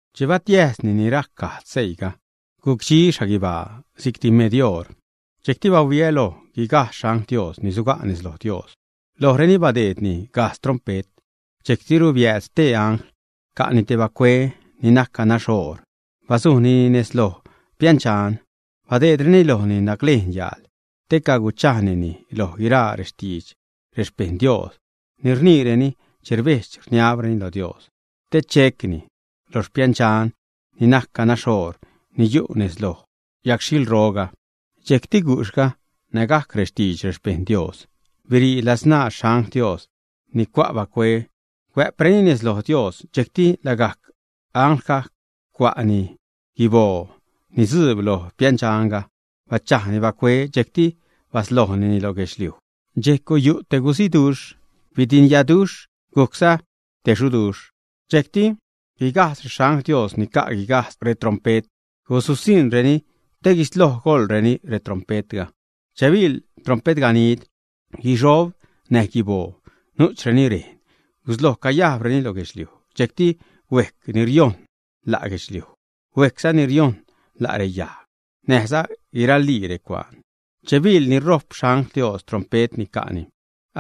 Che batiäjsni ni rajc gajdz seiiga, gucdxi xhaguibaa si'cti med oṟ. Dxejcti bahuiä loj guigajdz xangl Dios ni suga' nez loj Dios. Lojreni badeedreni gajdz trompe't. Dxejctiru biääd stee angl, ca'ni te bacue ni najc ganax oor, bazujnini nez loj piändxan. Badeedreni lojni naclejn yaal te cachaagnini loj guiraa rextidx xpejṉ Dios ni rniireni che rbedx-rniabreni lo Dios, te checni lo piändxan ni najc ganax oor, ni yu' nez loj yagxhilroga. Dxejcti gujxhga nägajc rextidx rexpejṉ Dios, birii ladsṉaa xangl Dios ni ca' bacue, huä'preni nez loj Dios. Dxejcti lagajc anglga cua'ni guiboo ni dzuub lo piändxanga, bachajni bacue, dxejcti baslojnini lo guedxliuj. Dxejc guyu' te guziduxh, bidinyaduxh, gujcza te xuduxh. Dxejcti guigajdz rexangl Dios ni ca' guigajdz retrompe't, guzusiṉreni te guisloj goḻreni retrompe'tga. Che biḻ trompetganid, guixob näj guiboo nu'chreni rejn gusloj cayajbreni loj guedxliuj. Dxejcti huejc ni riojṉ la' guedxliuj, huejcza ni riojṉ la' reyajg näjza guiralii recuaan. Che biḻ ni ṟojp xangl Dios trompe't ni ca'ni,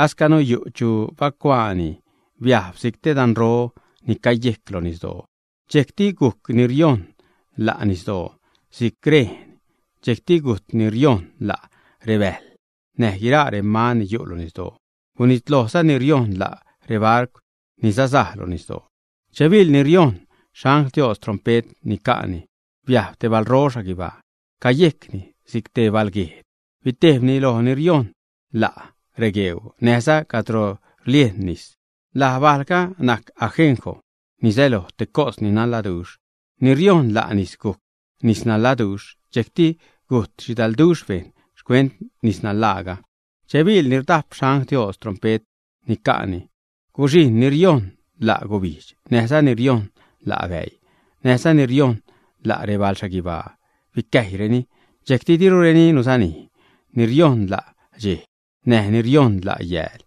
ascanu yu' chu bacuaani biajb si'c te danro ni cayejc loj nisdoo. Dxejcti gujc ni riojṉ la' nisdoo si'c rejn. Dxejcti gujt ni riojṉ la' rebäjl näj guiraa reman ni yu' loj nisdoo. Gunitlojza ni riojṉ la' rebarcw ni sazaj lo nisdoo. Che biḻ ni riojṉ xangl Dios trompe't ni ca'ni, biajb te balro xhaguibaa, cayejcni si'c te balguejd. Bitejbni loj ni riojṉ la' regueuu, näjza cadro rliejn nis. Laj bajlga najc Ajenjo, ni säloj te cos ni naṉladuxh. Ni riojṉ la' nis gujc nis naṉladuxh. Dxejcti gujt xhidalduxh bejṉ xcuent nisnaṉlaaga. Che biḻ ni rdajp xangl Dios trompe't ni ca'ni, guxhijṉ ni riojṉ la' gubijdx, näjza ni riojṉ la' bäii, näjza ni riojṉ la' rebal xhaguibaa, bicäjyreni. Dxejcti dirureni guzanij ni riojṉ la' dxej, näj ni riojṉ la' yääl.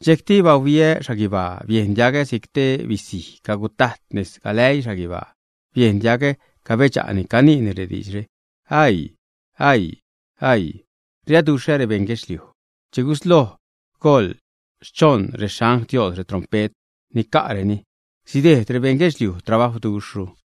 Dxejcti bahuiä xhaguibaa, biejn diagä si'c te bisij cagutajt nez galäii xhaguibaa. Biejn diagä cabedxa'ni, caniini rediidxre: ―¡Aii! ¡Aii! ¡Aii! Riaduxhä rebeṉ guedxliuj che guisloj goḻ schoṉ rexangl Dios retrompe't ni ca'reni. Sidejd rebeṉ guedxliuj trabajwduxhru.